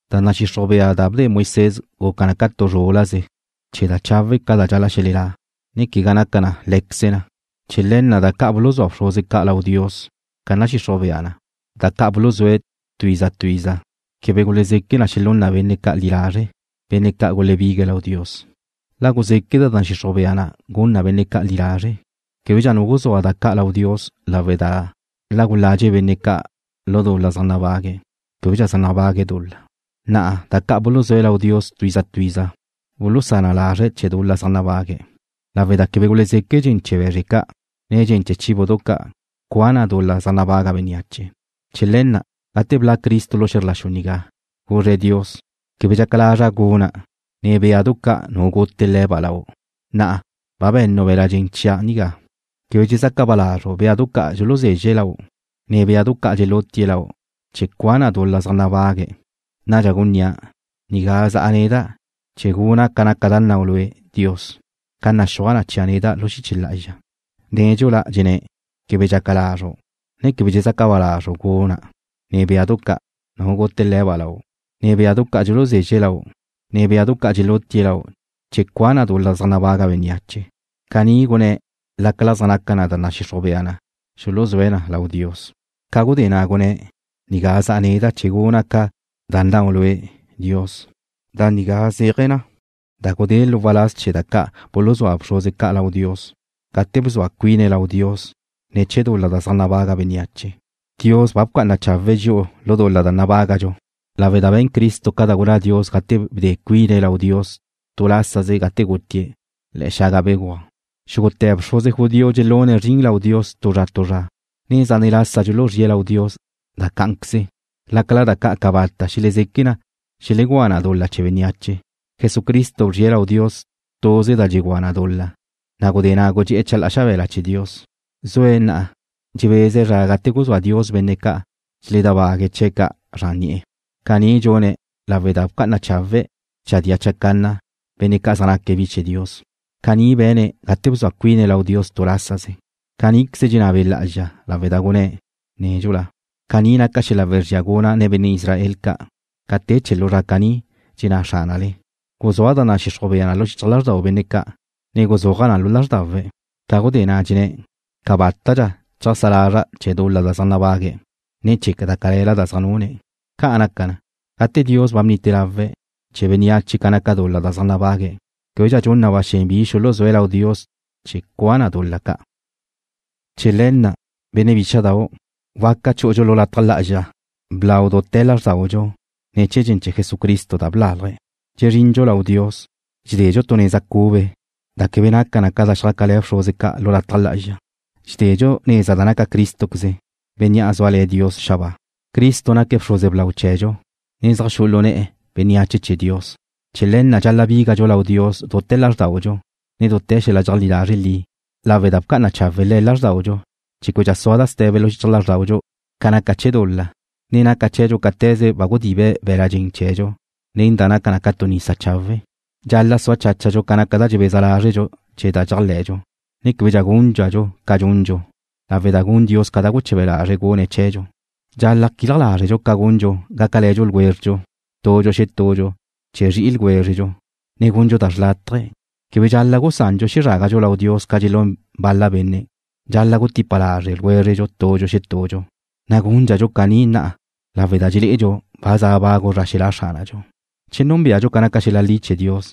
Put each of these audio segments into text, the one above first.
Da nadxixruj bea da bde Moisés guca na ca tu zrúl-laze chee̱ da chawe' ca' da dxal-la' xelelá', ne quegá naca na lé̱queze na. Chee̱ le̱ na' da ca' buluzúa bxruze ca' lau Dios ca nadxixruj bea na', da ca' buluzúe̱' tu iza tu iza, quebe gulezeque na xelún na benne' ca' li lazre', benne' ca' gulebigue̱' lau Dios. La guzeque' da nadxixruj bea na' gun na benne' ca' li lazre', québedxa nu guzúa da ca' lau Dios lawe' da la guladxe benne' ca' lu dul-la zaj nabague̱', québedxa zaj nabague̱' dul-la. Na'a da ca' buluzúe̱' lau Dios tu iza tu iza bulusá na lazre̱' chee̱ dul-la da zaj nabague̱', lawe' da quebe guzeque' dxen chee̱ be̱zre ca', ne dxen chee̱ béadu ca' cua na dul-la zaj nabaga bénneache. Chee̱ le̱ na', gate bla' Cristo lu xe̱zr la xu nigá, guzre̱' Dios: Quebe dxaca lazru' guna', ne béadu ca' nu gute le̱ba' lau'. Na'a ba be̱nu' be̱l-la' dxen chia' nigá. Quebe dxezaca ba lazru' béadu ca' dxuluzezxe̱' lau', ne béadu ca' dxelutie̱' lau' chee̱ cua na dul-la zaj nabague̱'. Nadxa gunnía': “Nigá za'a neda' chee̱ guna' ca da nnau' Lue', Dios, ca naxúaj na chia' neda' lu xiche lá'azxa.” Nédxula gunné̱': “Quebe dxaca lazru', ne quebe dxezaca ba lazru' guna', ne béadu ca' nu gute le̱ba' lau', ne béadu ca' dxuluzezxe̱' lau', ne béadu ca' dxelutie̱' lau' chee̱ cua na dul-la zaj nabaga bénneache.” Caní gunné̱' lácala zaj naca na da nadxixruj bea na xuluzúe̱' na lau Dios. Ca gudé na' gunné̱': “Nigá za'a neda' chee̱ guna' ca da nnau' Lue', Dios.” Da nigá zéaje̱ na gudée̱' lu waláz chee̱ da ca' buluzúa bxruze ca' lau Dios, gate bzua cuine̱' lau Dios ne̱ chee̱ dul-la zaj nabaga bénneache. Dios ba bca'ana chawe̱' dxi'u lu dul-la nabágadxu lawe' da be̱n Cristo ca da gunná Dios gate bde cuine̱' lau Dios tu lásaze gate gutie̱' le̱'e̱ xaga begúaj. Xúgute̱ bxruze judío dxelune̱' zrin lau Dios tu zra tu zra, ne zane' lasa dxuluzríe̱' lau Dios da cá'anqueze lácala da ca' cabata' xelezeque na xelegúa na dul-la chee̱ bénneache. Jesucristo bzrie̱' lau Dios tuze da dxugúa na dul-la, na' gudé na' gudxé'e̱ chalá'a xabe̱la chee̱ Dios. Zue̱' na'a dxebeze̱' zra gate guzúa Dios benne' ca' dxeledábague̱' chee̱' zran ni'e̱. Caní dxune̱' lawe' da bca'ana chawe̱' chadía chacanna benne' ca' zaj naque̱' bi chee̱ Dios. Caní be̱ne̱' gate bzua cuine̱' lau Dios tu lásaze. Caníqueze dxenná Be' Lá'azxa lawe' da gunné̱' nédxula: Caní naca xel-la' wezría guna' nen benne' Israel ca' ca te chee̱ lu zra caní, dxenná Xránale: Guzúa' da nadxixruj bea na' lu xichaj lázrdau benne' ca', ne guzúaja' na lu lázrdawe̱'. Ca gudé na' dxenné̱': Cabátadxa cheajsá lazra' chee̱ dul-la da zaj nabague̱', ne chee̱ da cale̱la ca' da zaj nune̱'. Ca'an naca, gate Dios ba bnite lawe̱' chee̱ bénneache ca naca dul-la da zaj nabague̱', québedxa dxun na ba xen bi xuluzúe̱' lau Dios chee̱ cua na dul-la ca'. Chee̱ le̱ na', benne' bícha'dau', waca chú'udxu lu lataj lá'azxa blau dute̱ lázrdaudxu ne̱ chee̱ dxen chee̱ Jesucristo da blalje̱'. Dxezrindxu lau Dios, dxededxu tu neza cube, da quebe naca na ca da xjácale̱ bxruze ca' lu lataj lá'azxa. Dxededxu neza da naca Crístoqueze, Bénnea' zúale̱ Dios xabáa. Jesús naque̱' bxruze blau chee̱dxu, ne zaj xu'u lu ne̱'e̱ bénneache chee̱ Dios. Chee̱ le̱ na' dxal-la' bígadxu lau Dios dute̱ lázrdaudxu ne dute̱ xel-la' dxeajlí lazre' li, lawe' da bca'ana chawe' Le̱' lázrdaudxu chee̱ québedxa sua da ste̱be lu xichaj lázrdaudxu ca naca chee̱ dul-la, ne naca chee̱dxu cáte̱ze ba gudibe̱' be̱l-la' dxen chee̱dxu nen da naca ca tu nisa chawe'. Dxal-la' sua cháchadxu ca naca da dxebeza lázredxu chee̱ da dxéajle̱dxu, ne quebe guchadxu ca dxundxu, lawe' da gun Dios ca da guche̱be lazre̱' gune̱' chee̱dxu. Dxal-la' quilaj lázredxu ca gundxu gácale̱ ljwézredxu tudxu xetudxu chee̱ zri'i ljwézredxu, ne gundxu da xrlátaje. Quebe dxal-la' gusandxu xezrágadxu lau Dios ca dxelún bal-la benne'. Dxal-la' gutipa lazre' ljwézredxu tudxu xetudxu, na' gúndxadxu caní na'a lawe' da dxelé'edxu ba za bagu zra xelá' Xránadxu. Che núnbeadxu ca naca xel-la' li chee̱ Dios,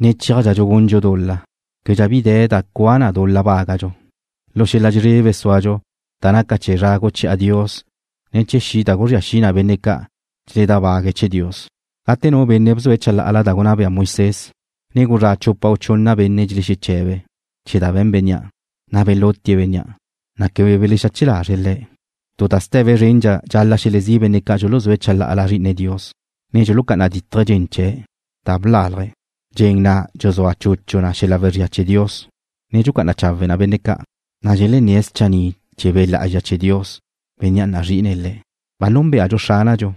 ne chéajdxadxu gundxu dul-la, québedxa bi de̱ da cua na dul-la bágadxu. Lu xel-la' dxezrebe súadxu da naca chee̱ zra guchi'a Dios, ne chee̱ xi' da guzría xi na benne' ca' dxeledábague̱' chee̱ Dios. Gate nu benne' bzue̱' chalá'ala da gunná bea Mnoisés, ne gulezrá' chupa u chunna benne' belexeche̱be̱' chee̱ da be̱n bénnea', na' belutie̱' bénnea', ne quebe belexache lazre̱' le̱'. Tu da ste̱be zrendxa dxal-la' xelezí' benne' ca' dxuluzúe̱' chalá'ala Zri'ine Dios, ne dxulucá'ana dítaje̱' dxen chee̱', da blalje̱', dxen na' dxuzúa chuchu na xel-la' wezría chee̱ Dios, ne dxucá'ana chawe na benne' ca', na' dxelenné̱' schanni' chee̱ Be' Lá'azxa chee̱ Dios, Bénnea' nazri'ine̱' le̱'. Ba núnbeadxu Xránadxu,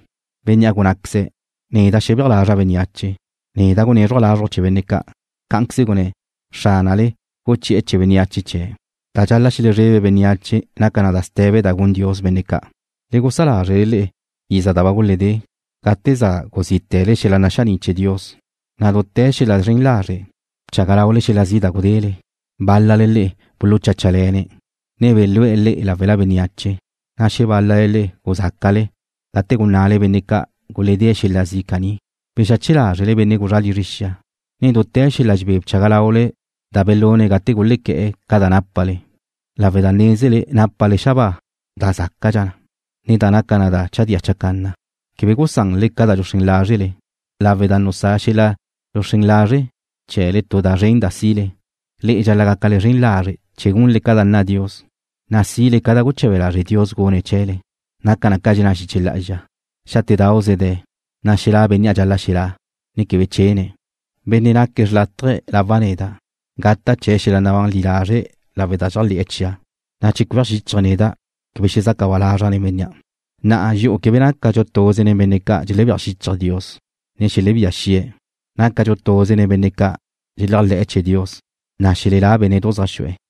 Bénnea' gunnáqueze̱': “Neda' xebéaj lazra' bénneache. Neda' gunézruja' lazruj chee̱ benne' ca'.” Cá'anqueze gunné̱': “Xránale guchi'e̱ chee̱ bénneache chee̱'.” Da dxal-la' xelezrebe bénneache naca da ste̱be da gun Dios benne' ca'. Le gusá lázrele le'e iza da ba guledé, gate za guzíte̱le xel-la' naxaní' chee̱ Dios, na' dute̱ xel-la' zren lazre' bchaga laule xel-la' zi' da gudele. Bál-lale le'e bulucháchale̱ne̱', ne belú'e̱ le'e láwela bénneache, na' xebál-lale le'e guzáca'le gate guná'ale benne' ca' guledée̱' xel-la' zi' caní. Bexache lázrele benne' gulezrá' lizre xia, ne dute̱ xel-la' dxebé bchaga laule da belune̱' gate gulequé̱'e̱ ca da nápale, lawe' da nézele nápale xabáa da zácadxa na, ne da naca na da chadía chacanna. Quebe gusanle ca da dxuxrén lázrele, lawe' da nusá xel-la' dxuxrén lazre' chee̱le tu da zren da si'le. Le'e dxal-la' gácale zren lazre' chee̱ gunle ca da nna Dios, na' sile ca da guche̱be lazre' Dios gunne̱' chee̱le. Naca na ca dxenná xiche lá'azxa: Xátedauze de̱, na' xelá' Bénnea' dxal-la' xelá', ne quebe chene̱'. Benne' naque̱' xlátaje̱ lawa' neda', gata' chee̱' xel-la' nabán li lazre' lawe' da dxéajle̱'e̱ chia', na' che cueaj xíchaje̱' neda' quebe xezaca ba lazra' nen bénnea'. Na'a dxi'u quebe nácadxu tuze nen benne' ca' dxelebéaj xíchaje̱' Dios, ne xelebía xi'e̱. Nácadxu tuze nen benne' dxeléajle̱'e̱ chee̱ Dios, na' xelelá bénne'du zaj xu'e̱.